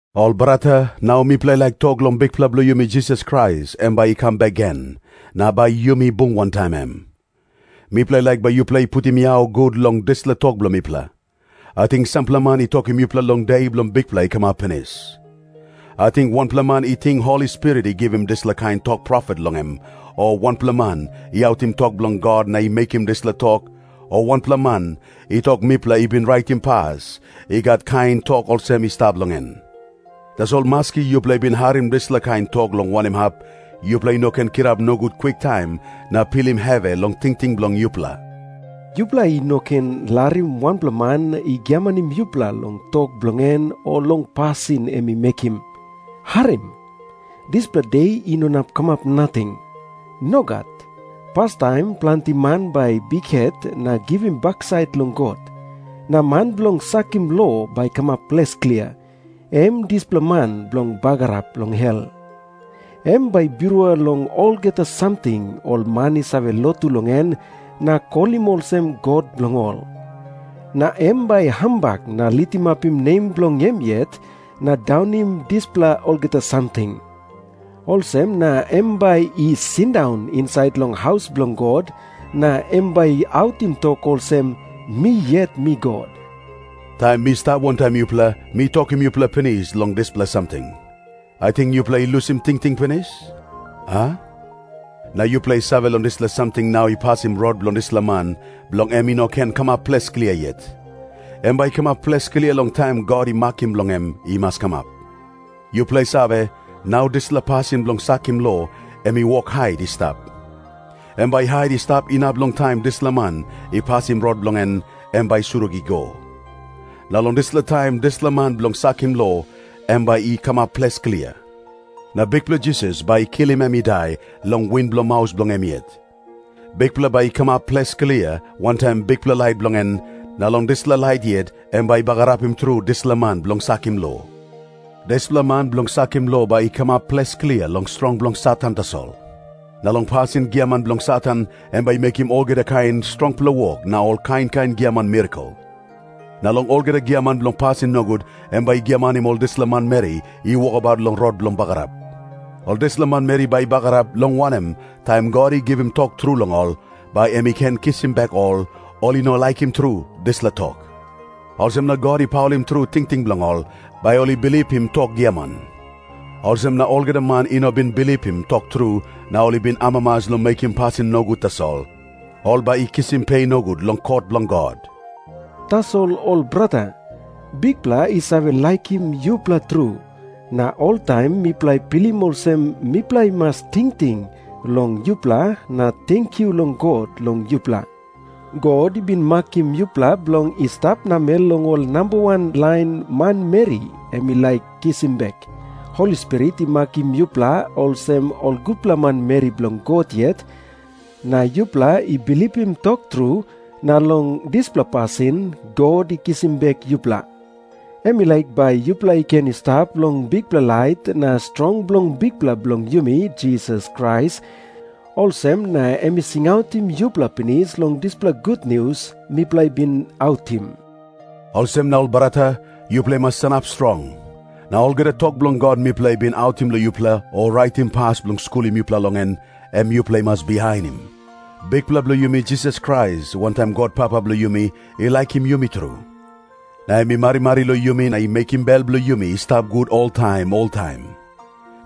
Ol brata, nau mipela i laik tok long Bikpela bilong yumi Jisas Krais em bai i kam bek gen, na bai yumi bung wantaim em. Mipela i laik bai yupela i putim yau gut long dispela tok bilong mipela. Ating sampela man i tokim yupela long De bilong Bikpela i kamap pinis. Ating wanpela man i ting Holi Spirit i givim dispela kain tok profet long em, o wanpela man i autim tok bilong God na i mekim dispela tok, o wanpela man i tok mipela i bin raitim pas i gat kain tok olsem i stap long en. Tasol maski yupela i bin harim dispela kain tok long wanem hap, yupela i no ken kirap nogut kwiktaim na pilim hevi long tingting bilong yupela. Yupela i no ken larim wanpela man i giamanim yupela long tok bilong en o long pasin em i mekim. Harim. Dispela De i no inap kamap nating. Nogat. Pastaim planti man bai i bikhet na givim baksait long God. Na man bilong sakim lo bai i kamap ples klia, em dispela man bilong bagarap long hel. Em bai i birua long olgeta samting ol man i save lotu long en na kolim olsem god bilong ol. Na em bai i hambak na litimapim nem bilong em yet na daunim dispela olgeta samting. Olsem na em bai i sindaun insait long haus bilong God, na em bai i autim tok olsem, "Mi yet mi God." Taim mi stap wantaim yupela mi tokim yupela pinis long dispela samting. Ating yupela i lusim tingting pinis, a? Na yupela i save long dispela samting nau i pasim rot bilong dispela man, bilong em i no ken kamap ples klia yet. Em bai i kamap ples klia long taim God i makim bilong em i mas kamap. Yupela i save, nau dispela pasin bilong sakim lo em i wok hait i stap. Em bai i hait i stap inap long taim dispela man i pasim rot bilong en, em bai i surik i go. Na long dispela taim dispela man bilong sakim lo em bai i kamap ples klia. Na Bikpela Jisas bai i kilim em i dai long win bilong maus bilong em yet. Bikpela bai i kamap ples klia wantaim bikpela lait bilong en, na long dispela lait yet em bai i bagarapim tru dispela man bilong sakim lo. Dispela man bilong sakim lo bai i kamap ples klia long strong bilong Satan tasol. Na long pasin giaman bilong Satan em bai i mekim olgeta kain strongpela wok na ol kain kain giaman mirakel. Na long olgeta giaman bilong pasin nogut em bai i giamanim ol dispela manmeri i wokabaut long rot bilong bagarap. Ol dispela manmeri bai i bagarap, long wanem, taim God i givim tok tru long ol, bai em i ken kisim bek ol, ol i no laikim tru dispela tok. Olsem na God i paulim tru tingting bilong ol, bai ol i bilipim tok giaman. Olsem na olgeta man i no bin bilipim tok tru, na ol i bin amamas long mekim pasin nogut tasol, ol bai i kisim pe nogut long kot bilong God. Tasol ol brata, Bikpela i save laikim yupela tru, na oltaim mipela i pilim olsem mipela i mas tingting long yupela na tenkyu long God long yupela. God i bin makim yupela bilong i stap namel long ol namba wan lain manmeri em i laik kisim bek. Holi Spirit i makim yupela olsem ol gutpela manmeri bilong God yet, na yupela i bilipim tok tru, na long dispela pasin God i kisim bek yupela. Em i laik bai yupela i ken i stap long bikpela lait na strong bilong Bikpela bilong yumi Jisas Krais, olsem na em i singautim yupela pinis long dispela gutnius mipela i bin autim. Olsem na, ol brata, yupela i mas sanap strong. Na olgeta tok bilong God mipela i bin autim long yupela o raitim pas bilong skulim yupela long en, em yupela i mas bihainim. Bikpela bilong yumi Jisas Krais, wantaim God Papa bilong yumi, i laikim yumi tru. Na em i marimari long yumi na i mekim bel bilong yumi i stap gut oltaim oltaim.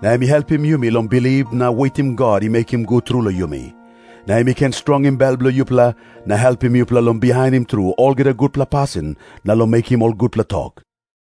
Na em i helpim yumi long bilip na wetim God i mekim gut tru long yumi. Na em i ken strongim bel bilong yupela, na helpim yupela long bihainim tru olgeta gutpela pasin na long mekim ol gutpela tok.